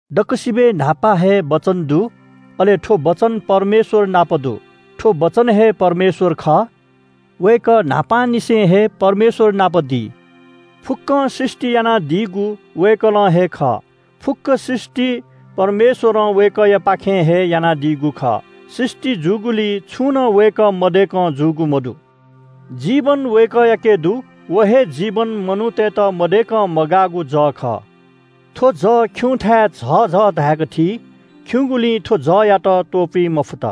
दक्‍वसिबय् न्‍हापा हे वचन दु, अले थ्‍व वचन परमेश्‍वर नाप दु। थ्‍व वचन हे परमेश्‍वर खः। वय्‌कः न्‍हापांनिसें हे परमेश्‍वर नाप दी। फुक्‍कं सृष्‍टि यानादीगु वय्‌कलं हे खः। फुक्‍क सृष्‍टि परमेश्‍वरं वय्‌कःयापाखें हे यानादीगु खः। सृष्‍टि जूगुलिइ छुं नं वय्‌कः मदय्‌कं जूगु मदु। जीवन वय्‌कःयाके दु। व हे जीवन मनूतय्‌त मदय्‌कं मगाःगु जः खः। थ्‍व जः खिउँथाय् झःझः धाय्‌क थी, खिउँगुलिं थ्‍व जःयात त्‍वपुइ मफुत।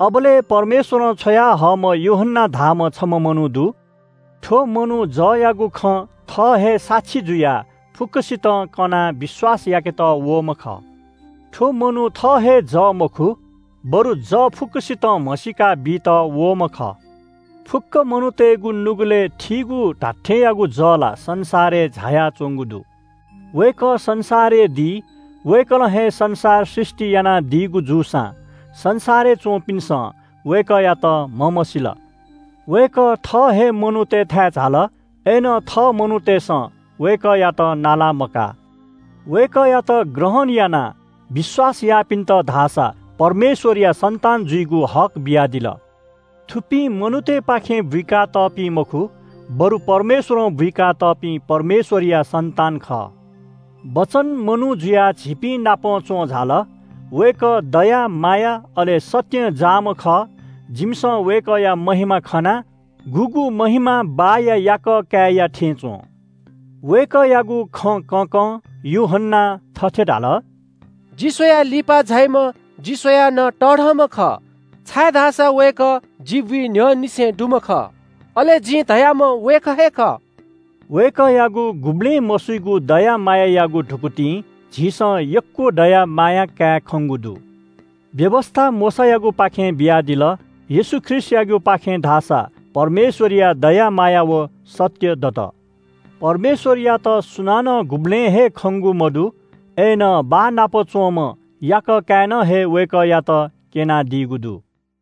अबलय् परमेश्‍वरं छ्वयाहःम्‍ह यूहन्‍ना धाःम्‍ह छम्‍ह मनू दु। थ्‍व मनू जःयागु खँ थः हे साक्षी जुयाः फुक्‍कसितं कनाः विश्‍वास याकेत वःम्‍ह खः। थ्‍व मनू थः हे जः मखु, बरु जः फुक्‍कसितं म्‍हसीका बीत वःम्‍ह खः। फुक्‍क मनूतय्‌गु नुगलय् थीगु धात्‍थेंयागु जः ला संसारय् झायाच्‍वंगु दु। वय्‌कः संसारय् दी, वय्‌कलं हे संसार सृष्‍टि यानादीगु जूसां संसारय् च्‍वंपिन्‍सं वय्‌कःयात म्‍हमसील। वय्‌कः थः हे मनूतय्‌थाय् झाल। अय्‌नं थः मनूतय्‌सं वय्‌कःयात नाला मकाः। वय्‌कःयात ग्रहण यानाः विश्‍वास याःपिन्‍त धाःसा परमेश्‍वरया सन्‍तान जुइगु हक बियादिल। थुपिं मनूतय्‌पाखें बुइका तःपिं मखु, बरु परमेश्‍वरं बुइका तःपिं परमेश्‍वरया सन्‍तान खः। वचन मनू जुयाः झीपिं नाप च्‍वं झाल। वय्‌कः दया माया, अले सत्‍यं जाःम्‍ह खः। जिमिसं वय्‌कःया महिमा खना, गुगु महिमा बाःया याकः काय्‌या थें च्‍वं। वय्‌कःयागु खँ कँकं यूहन्‍नां थथे धाल – “जि स्‍वयाः लिपा झाइम्‍ह जि स्‍वयाः नं तःधंम्‍ह खः छाय्‌धाःसा वय्‌कः जि बुइ न्‍ह्यःनिसें दुम्‍ह खः। अले जिं धयाम्‍ह वय्‌कः हे खः।” वय्‌कःयागु गुबलें मसुइगु दया मायायागु धुकुतिं झीसं यक्‍व दया माया काये खंगु दु। व्‍यवस्‍था मोशायागुपाखें बियादिल, येशू ख्रीष्‍टयागुपाखें धाःसा परमेश्‍वरया दया माया व सत्‍य दत। परमेश्‍वरयात सुनानं गुबलें हे खंगु मदु। अय्‌नं बाः नाप च्‍वंम्‍ह याकः काय्‌नं हे वय्‌कःयात क्‍यनादीगु दु।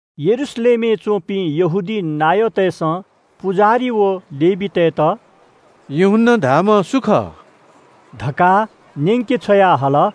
यरूशलेमय् च्‍वंपिं यहूदी नायःतय्‌सं पुजाहारी व लेवीतय्‌त “यूहन्‍ना धाःम्‍ह सु खः” धकाः न्‍यंके छ्वयाहल।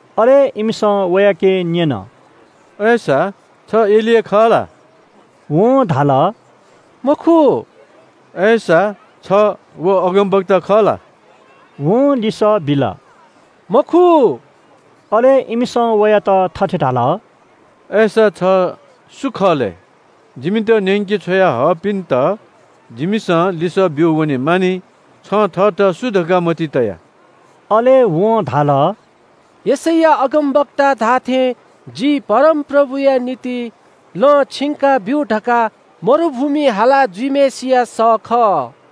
अले इमिसं वयाके न्‍यन – “अय्‌सा छ एलिया खः ला?” वं धाल – “मखु।” “अय्‌सा छ व अगमवक्ता खः ला?” वं लिसः बिल – “मखु।” अले इमिसं वयात थथे धाल – “अय्‌सा छ सु खः लय्? जिमित न्‍यंके छ्वया हःपिन्‍त जिमिसं लिसः ब्‍यू वनेमानि। छं थःत सु धकाः मतिइ तया?” अले वं धाल – “यशैया अगमवक्तां धाःथें जि परमप्रभुया निंतिं लँ छिंकाब्‍यु धकाः मरुभूमिइ हाला जुइम्‍हय्‌सिया सः खः।”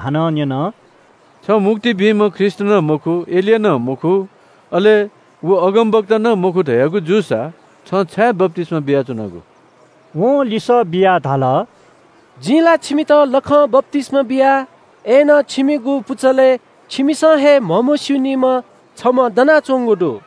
हानं न्‍यन – “छ मुक्ति बीम्‍ह ख्रीष्‍ट नं मखु, एलिया नं मखु, अले व अगमवक्ता नं मखु धयागु जूसा छं छाय् बप्‍तिस्‍मा बियाच्‍वनागु?” वं लिसः बियाः धाल – “जिं ला छिमित लखं बप्‍तिस्‍मा बिया, अय्‌नं छिमिगु पुचलय् छिमिसं हे म्‍हमस्‍यूनिम्‍ह छम्‍ह दनाच्‍वंगु दु।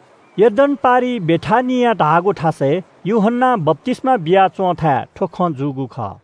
यर्दन पारिइ बेथानिया धाःगु थासय् यूहन्‍नां बप्‍तिस्‍मा बिया च्‍वंथाय् थ्‍व खँ जूगु खः।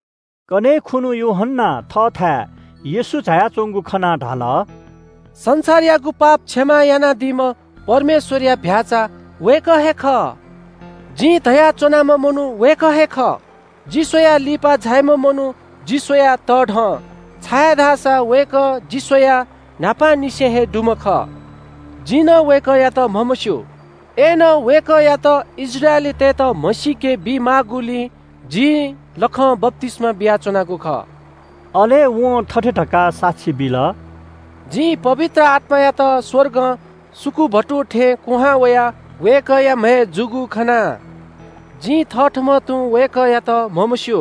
कन्‍हय् खुन्‍हु यूहन्‍नां थःथाय् येशू झायाच्‍वंगु खनाः धाल – “संसारयागु पाप क्षमा यानादीम्‍ह परमेश्‍वरया चीधिकःम्‍ह भ्‍याःचा वय्‌कः हे खः। जिं धया च्‍वनाम्‍ह मनू वय्‌कः हे खः – ‘जि स्‍वयाः लिपा झाइम्‍ह मनू जि स्‍वयाः तःधं, छाय्‌धाःसा वय्‌कः जि स्‍वयाः न्‍हापांनिसें हे दुम्‍ह खः।’ जिं नं वय्‌कःयात म्‍हमस्‍यू, अय्‌नं वय्‌कःयात इस्राएलीतय्‌त म्‍हसीके बी माःगुलिं जिं लखं बप्‍तिस्‍मा बियाच्‍वनागु खः।” अले वं थथे धकाः साक्षी बिल – “जिं पवित्र आत्‍मायात स्‍वर्गं सुकुभतु थें कुहां वयाः वय्‌कःया म्‍हय् जूगु खना। जिं थथःम्‍हं तुं वय्‌कःयात म्‍हमस्‍यू,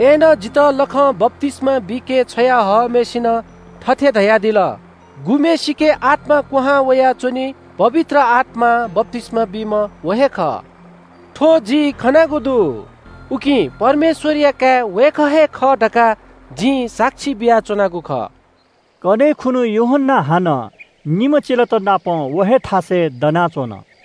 अय्‌नं जितः लखं बप्‍तिस्‍मा बीके छ्वया हःम्‍हय्‌सिनं थथे धयादिल – ‘गुम्‍हय्‌सिके आत्‍मा क्‍वहां वयाः च्‍वनी, पवित्र आत्‍मां बप्‍तिस्‍मा बीम्‍ह व हे खः।’ थ्‍व जिं खनागु दु, उकिं परमेश्‍वरया काय् वय्‌कः हे खः धकाः जिं साक्षी बियाच्‍वनागु खः।” कन्‍हय् खुन्‍हु यूहन्‍ना हानं निम्‍ह चेलात नाप व हे थासय् दनाच्‍वन।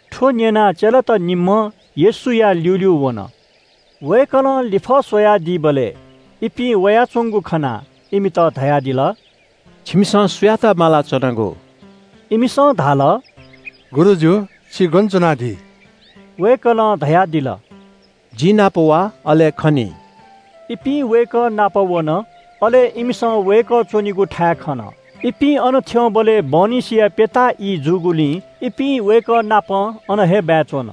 थ्‍व न्‍यनाः चेलात निम्‍हं येशूया ल्‍यूल्‍यू वन। वय्‌कलं लिफः स्‍वयादीबलय् इपिं वयाच्‍वंगु खनाः इमित धयादिल – “छिमिसं सुयात माला च्‍वनागु?” इमिसं धाल – “गुरुजु, छि गन च्‍वनादी?” वय्‌कलं धयादिल – “जि नाप वा, अले खनी।” इपिं वय्‌कः नाप वन, अले इमिसं वय्‌कः च्‍वनीगु थाय् खन। इपिं अन थ्‍यंबलय् बहनिसिया प्‍यता ई जूगुलिं इपिं वय्‌कःनापं अन हे बाय् च्‍वन।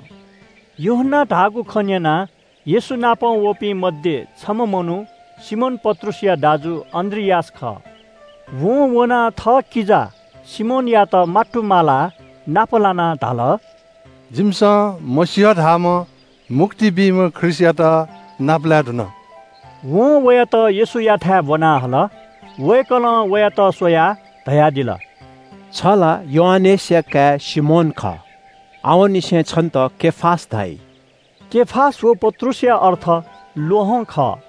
यूहन्‍नां धाःगु खँ न्‍यनाः येशू नाप वंपिं मध्‍ये छम्‍ह मनू सिमोन पत्रुसया दाजु अन्‍द्रियास खः। वं वनाः थःकिजा सिमोनयात मात्तुमालाः नापलाना धाल – “जिमिसं मसीह धाःम्‍ह मुक्ति बीम्‍ह ख्रीष्‍टयात नापलाये धुन।” वं वयात येशूयाथाय् ब्‍वना हल। वय्‌कलं वयात स्‍वयाः धयादिल – “छ ला योआनेसया काय् सिमोन खः। आवंनिसें छन्‍त केफास धाइ।” केफास व पत्रुसया अर्थ “ल्‍वहं” खः।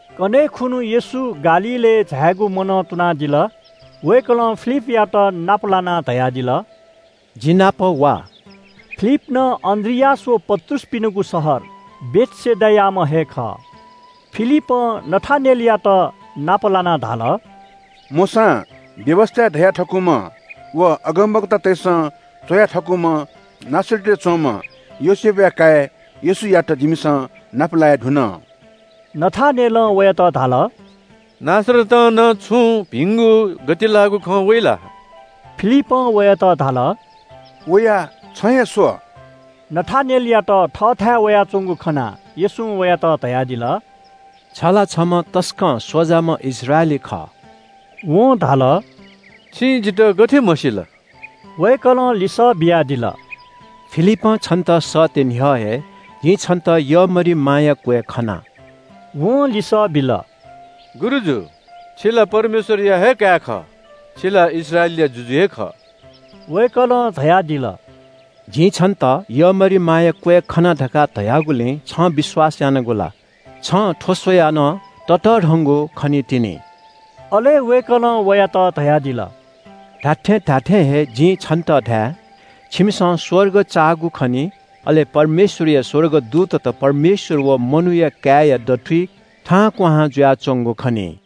कन्‍हय् खुन्‍हु येशूं गालीलय् झायेगु मनं तुनादिल। वय्‌कलं फिलिपयात नाप लानाः धयादिल – “जि नाप वा।” फिलिप नं अन्‍द्रियास व पत्रुसपिनिगु शहर बेथसेदायाम्‍ह हे खः। फिलिपं नथानेलयात नाप लानाः धाल – “मोशां व्‍यवस्‍थाय् धया थकूम्‍ह व अगमवक्तातय्‌सं च्‍वया थकूम्‍ह नासरतय् च्‍वंम्‍ह योसेफया काय् येशूयात जिमिसं नापलाये धुन।” नथानेलं वयात धाल – “नासरतं नं छुं भिंगु गतिलाःगु खँ वइ ला?” फिलिपं वयात धाल – “वयाः छं हे स्‍व।” नथानेलयात थःथाय् वयाच्‍वंगु खनाः येशूं वयात धयादिल – “छ ला छम्‍ह तसकं स्‍वजाम्‍ह इस्राएली खः।” वं धाल – “छिं जितः गथे म्‍हसिल?” वय्‌कलं लिसः बियादिल – “फिलिपं छन्‍त सःते न्‍ह्यः हे जिं छन्‍त यःमरिमाया क्‍वय् खना।” वं लिसः बिल – “गुरुजु, छि ला परमेश्‍वरया हे काय् खः। छि ला इस्राएलया जुजु हे खः।” वय्‌कलं धयादिल – “जिं छन्‍त यःमरिमाया क्‍वय् खना धकाः धयागुलिं छं विश्‍वास यानागु ला? छं थ्‍व स्‍वयाः नं ततःधंगु खनीतिनि।” अले वय्‌कलं वयात धयादिल – “धात्‍थें धात्‍थें हे जिं छन्‍त धाये – छिमिसं स्‍वर्ग चाःगु खनी, अले परमेश्‍वरया स्‍वर्गदूतत परमेश्‍वर व मनूया काय्‌या दथुइ थाहां क्‍वहां जुयाच्‍वंगु खनी।”